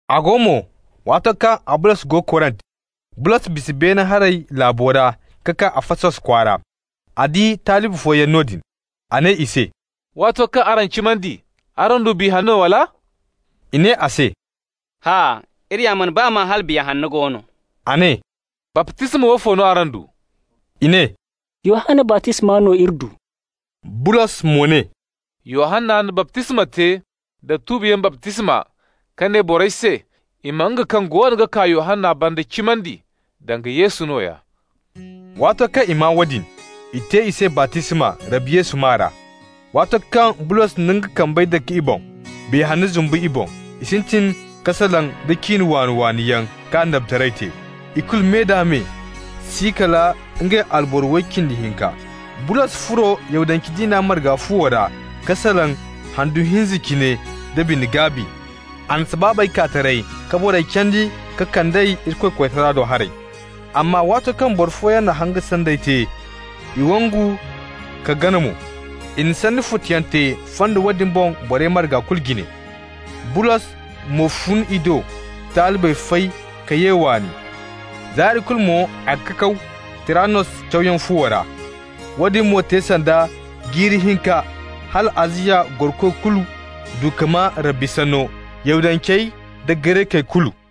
A go mo, waato kaŋ Abolos go Korint, Bulos bisa beene haray laabo ra ka kaa Afasos kwaara. A di talibi fooyaŋ noodin. A ne i se: «Waato kaŋ araŋ cimandi, araŋ du Biya Hanno, wala?» I ne a se: «Hã'a. Iri ya mana baa maa hala Biya Hanno go no.» A ne: «Baptisma woofo no araŋ du?» I ne: «Yohanna baptisma no iri du.» Bulos mo ne: «Yohanna na baptisma te da tuubiyaŋ baptisma ka ne borey se i ma nga kaŋ goono ga kaa Yohanna banda cimandi, danga Yesu nooya.» Waato kaŋ i maa woodin, i te i se baptisma Rabbi Yesu maa ra. Waato kaŋ Bulos na nga kambey dake i boŋ, Biya Hanna zumbu i boŋ. I sintin ka salaŋ da ciine waani-waani yaŋ ka annabitaray te. Ikulu me-da-me si kala ngey alboro way cindi hinka. Bulos furo Yahudance diina marga fuwo ra ka salaŋ handu hinza cine da bine-gaabi. A na sabaabey kaa taray, ka borey candi ka kand'ey Irikoy koytara do haray. Amma waato kaŋ boro fooyaŋ na hanga sanday te, i wangu ka gana mo, i na sanni futuyaŋ te fondo woodin boŋ borey marga kulu jine. Bulos mo fun i do ka talibey fay ka ye waani. Zaari kulu mo a ga kakaw Tiranos cawyaŋ fuwo ra. Woodin mo te sanda jiiri hinka hala Aziya gorokoy kulu du ka maa Rabbi sanno, Yahudancey da Garekey kulu.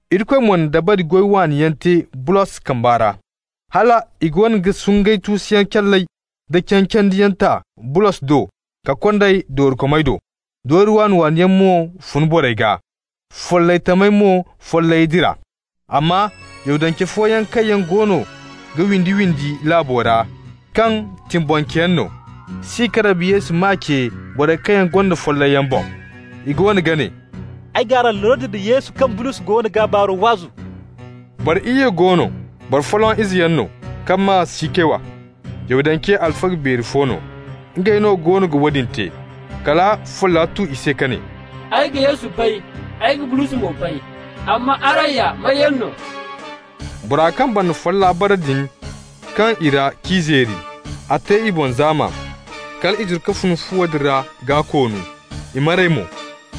Irikoy mo na dabari goy waani yaŋ te Bulos kambe ra, hal i goono ga sungay tuusuyaŋ calley da cancandiyaŋ ta Bulos do ka kond'ey doorikomey do. Doori waani-waani yaŋ mo fun borey gaa, follay tamey mo follayey dira. Amma Yahudance fooyaŋ kaŋ yaŋ goono ga windi-windi laabo ra, kaŋ tibbonceyaŋ no, si ka Rabbi Yesu maa ce borey kaŋ gonda follayyaŋ boŋ. I goono ga ne: «Ay g'araŋ lordi da Yesu kaŋ Bulos goono g'a baaro waazu.» Boro iyye go no, boro folloŋ izeyaŋ no, kaŋ maa Sikewa, Yahudance alfaga beeri fo no. Ngey no goono ga woodin te. Kala folla tu i se ka ne: «Ay ga Yesu bay, ay ga Bulos mo bay, amma araŋ ya may yaŋ no?» Bora kaŋ banda folla bara din kaŋ i ra k'i zeeri. A te i boŋ zaama, kal i zuru ka fun fuwo din ra gaa-koonu. I maray mo.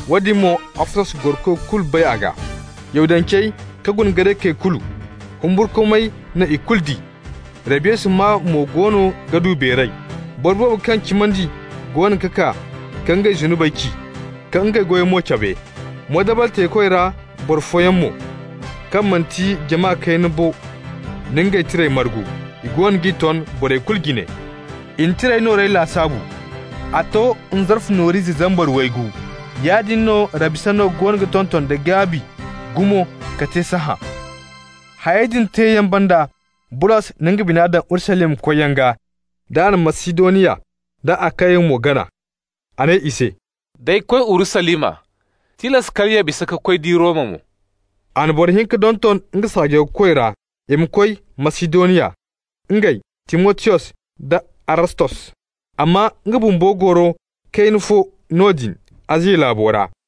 Woodin mo, Afasos gorokoy kulu bay a gaa, Yahudancey ka guna Garekey kulu. Humburkumay na ikulu di, Rabbi Yesu maa mo goono ga du beeray. Boro boobo kaŋ cimandi goono ga kaa ka ngey zunubey ci, ka ngey goyey mo cabe. Moodabal teekoy ra boro fooyaŋ mo, kaŋ manti jama kayna bo na ngey tirey margu. I goono g'i ton borey kulu jine. I na tirey noorey lasaabu. A to nzarfu noor'ize zambar waygu. Yaadin no Rabbi sanno goono ga tonton da gaabi gumo ka te sahã. Hayey din teeyaŋ banda, Bulos na nga bina daŋ Urusalima koyyaŋ gaa, d'a na Masidoniya da Akaya mo gana. A ne i se: «D'ay koy Urusalima, tilas kala ya bisa ka koy di Roma mo.» A na boro hinka donton nga saajawkoy ra, i ma koy Masidoniya, ngey Timotiyos da Arastos, amma nga bumbo goro kayna fo noodin Aziya laabo ra.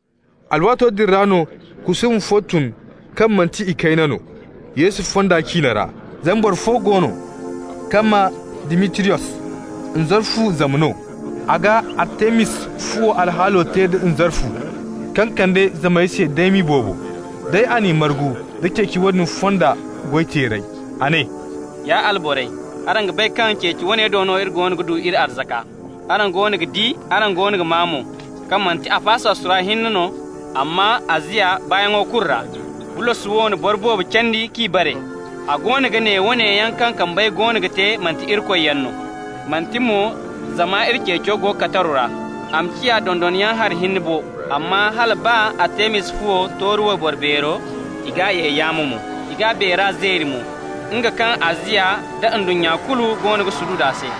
Alwaato din ra no kusuuma fo tun kaŋ manti ikayna no, Yesu fonda ciine ra. Zama boro fo go no kaŋ maa Dimitriyos, nzarfu zam no. A ga Artemis fuwo alhaalo te da nzarfu, kaŋ kande zamey se daymi boobo. Day, a n'i margu, da ceeci woodin fonda goy-teerey. A ne: «Ya alborey, araŋ ga bay kaŋ ceeci woone do no iri goono ga du iri arzaka. Araŋ goono ga di, araŋ goono ga maa mo, kaŋ manti Afasos ra hinne no, amma Aziya baayaŋo kulu ra, Bulos wo na boro boobo candi k'i bare. A goono ga ne woone yaŋ kaŋ kambey goono ga te manti irikoyyaŋ no. Manti mo zama iri ceeco go kataru ra a ma ciya dondayaŋ hari hinne bo, amma hala baa Artemis fuwo, tooru wayboro beero, i g'a ye yaamo mo. I g'a beera zeeri mo, nga kaŋ Aziya nda ndunnya kulu goono ga sududu a se.»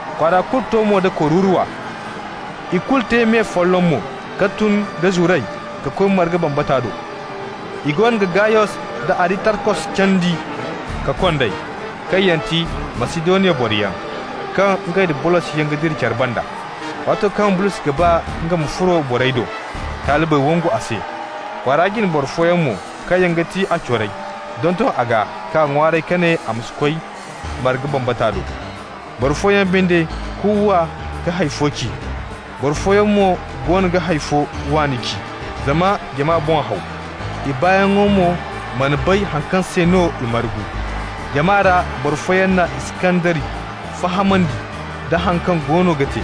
Kwaara kulu to mo da kururuwa. I kulu te me folloŋ mo ka tun da zuray ka koy marga batama do. I goono ga Gayos da Aristarkos candi ka kond'ey, kaŋ yaŋ ti Masidoniya boroyaŋ, kaŋ ngey da Bulosyaŋ ga dira care banda. Waato kaŋ Bulos ga ba nga ma furo borey do, talibey wangu a se. Kwaara jine boro fooyaŋ mo, kaŋ yaŋ ti a corey, donton a gaa k'a ŋwaaray ka ne a ma si koy marga batama do. Boro fooyaŋ binde kuuwa ka hay fo ci, boro fooyaŋ mo goono ga hay fo waani ci. Zama jama boŋ haw, i baayaŋo mo mana bay haŋ kaŋ se no i margu. Jama ra boro fooyaŋ na Iskandari fahamandi da haŋ kaŋ goono ga te.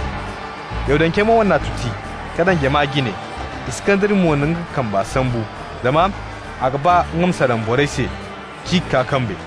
Yahudancey mo n'a tuti ka daŋ jama jine. Iskandari mo na nga kamba sambu, zama a ga ba nga ma salaŋ borey se k'i kaa kambe.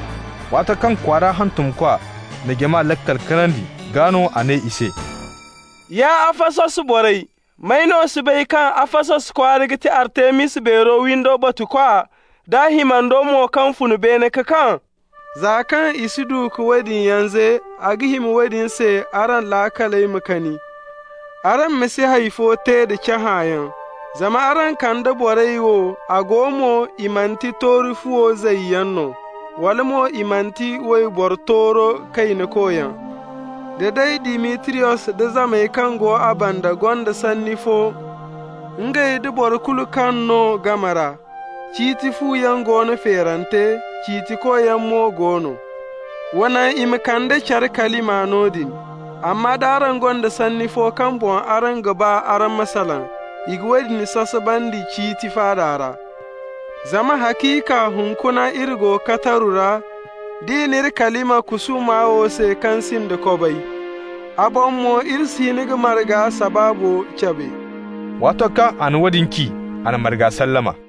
Waato kaŋ kwaara hantumkwa na jama laakal kanandi, gaa no a ne i se: «Ya Afasos borey, may no si bay kaŋ Afasos kwaara ga ti Artemis beero windo batukwa, d'a himando mo kaŋ fun beene ka kaŋ? Za kaŋ i si du ka woodin yaŋ ze, a ga hima woodin se araŋ laakaley ma kani, araŋ ma si hay fo te da cahãyaŋ. Zama araŋ kanda borey wo, a go mo, i manti tooru fuwo zayyaŋ no, wala mo i manti iri wayboro tooro kaynakoyaŋ. Da day Dimitriyos da zamey kaŋ go a banda gonda sanni fo ngey da boro kulu kaŋ no game ra, ciiti fuyaŋ go no feerante, ciitikoyaŋ mo go no. Wa naŋ i ma kande care kalima noodin. Amma d'araŋ gonda sanni fo kaŋ boŋ araŋ ga ba araŋ ma salaŋ, i ga woodin sasabandi ciiti faada ra. Zama haciika hunkuna iri go kataru ra, d'i n'iri kalima kusuuma wo se, kaŋ sinda kobay. A boŋ mo iri si hin ka marga sabaabo cabe.» Waato kaŋ a na woodin ci, a na marga sallama.